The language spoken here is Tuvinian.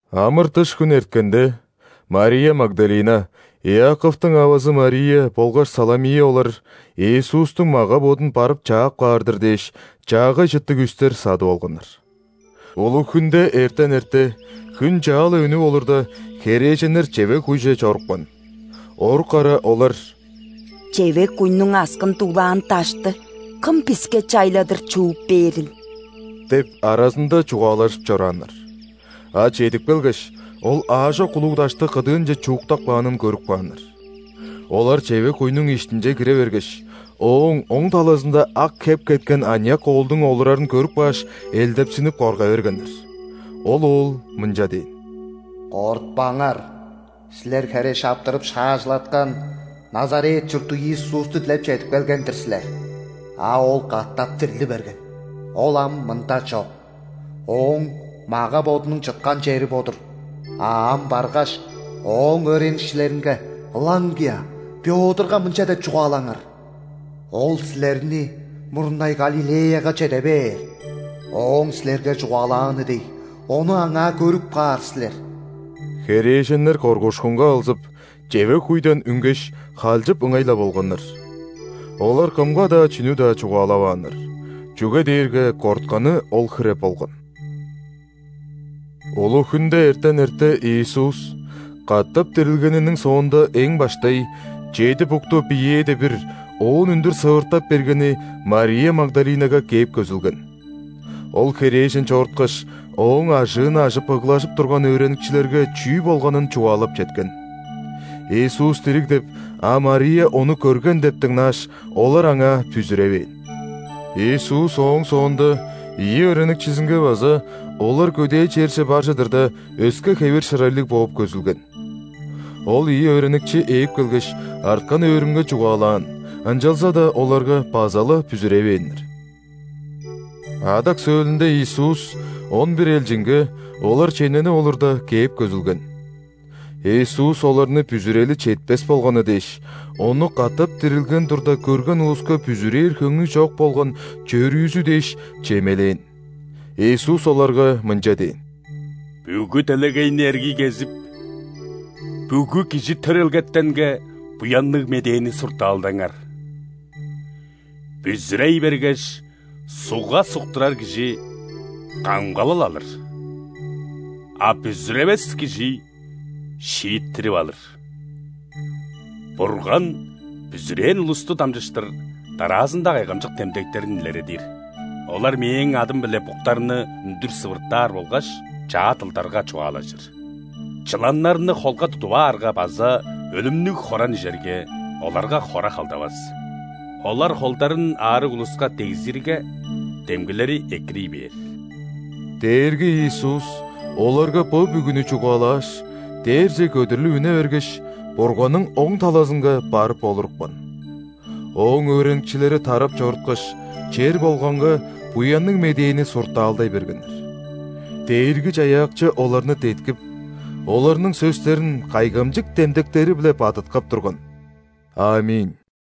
Амыр-дыш хүнү эрткенде, Мария Магдалина, Иаковтуң авазы Мария болгаш Саломия олар, Иисустуң мага-бодун барып чаап каар-дыр дээш, чаагай чыттыг үстер садып алганнар. Улуг-хүнде, эртен эрте, хүн чаа-ла үнүп олурда, херээженнер чевег-куйже чорупкан. Орук ара олар: «Чевег-куйнуң аксын дуглаан дашты кым биске чайладыр чууп бээрил?» – деп аразында чугаалажып чорааннар. А чедип келгеш, ол аажок улуг дашты кыдыынче чууктап каанын көрүп кааннар. Олар чевег-куйнуң иштинче кире бергеш, ооң оң талазында ак хеп кеткен аныяк оолдуң олурарын көрүп кааш, элдепсинип корга бергеннер. Ол оол мынча дээн: «Кортпаңар. Силер хере шаптырып шаажылаткан Назарет чурттуг Иисусту дилеп чедип келген-дир силер. А Ол катап дирли берген, Ол ам мында чок. Ооң мага-бодунуң чыткан чери бо-дур. А ам баргаш, Ооң өөреникчилеринге, ылаңгыя Пётрга мынча деп чугаалаңар: „Ол силерни мурнай Галилеяга чеде бээр. Ооң силерге чугаалааны дег, Ону аңаа көрүп каар силер“». Херээженнер коргуушкунга алзып, чевег-куйдан үнгеш, халчып ыңай-ла болганнар. Олар кымга-даа чүнү-даа чугаалавааннар, чүге дээрге кортканы ол хире болган. [Улуг-хүнде эртен эрте Иисус, катап дирилгениниң соонда эң баштай, чеди букту биеэде бир оон үндүр сывыртап бергени Мария Магдалинага кээп көзүлген. Ол херээжен чоруткаш, Ооң ажыын ажып ыглажып турган өөреникчилерге чүү болганын чугаалап четкен. Иисус дириг деп, а Мария Ону көрген деп дыңнааш, олар аңаа бүзүревээн. Иисус ооң соонда ийи өөреникчизинге база, олар көдээ черже бар чыдырда, өске хевир-шырайлыг бооп көзүлген. Ол ийи өөреникчи ээп келгеш, арткан өөрүнге чугаалаан, ынчалза-даа оларга база-ла бүзүревээннер. Адак сөөлүнде Иисус он бир элчинге, олар чемненип олурда, кээп көзүлген. Иисус оларны бүзүрели четпес болганы дээш, Ону катап дирилген турда көрген улуска бүзүрээр хөңнү чок болган чөрүүзү дээш, чемелээн. Иисус оларга мынча дээн: «Бүгү делегейни эргий кезип, бүгү кижи төрелгетенге Буянныг Медээни суртаалдаңар. Бүзүрей бергеш, ·сугга суктурар кижи – камгалал алыр, а бүзүревес кижи – шииттирип алыр. Бурган бүзүрээн улусту дамчыштыр дараазында кайгамчык демдектерин илередир: олар Мээң адым-биле буктарны үндүр сывыртаар болгаш чаа дылдарга чугаалажыр; чыланнарны холга тудуп аарга база өлүмнүг хоран ижерге, оларга хора халдавас. Олар холдарын аарыг улуска дегзирге, демгилери экирий бээр». Дээрги Иисус оларга бо бүгүнү чугаалааш, дээрже көдүрлүп үне бергеш, Бурганның оң талазынга барып олурупкан. Ооң өөреникчилери тарап чоруткаш, чер болганга Буянныг Медээни суртаалдай бергеннер. Дээрги-Чаяакчы оларны деткип, оларның сөстерин кайгамчык демдектери-биле бадыткап турган. Аминь.]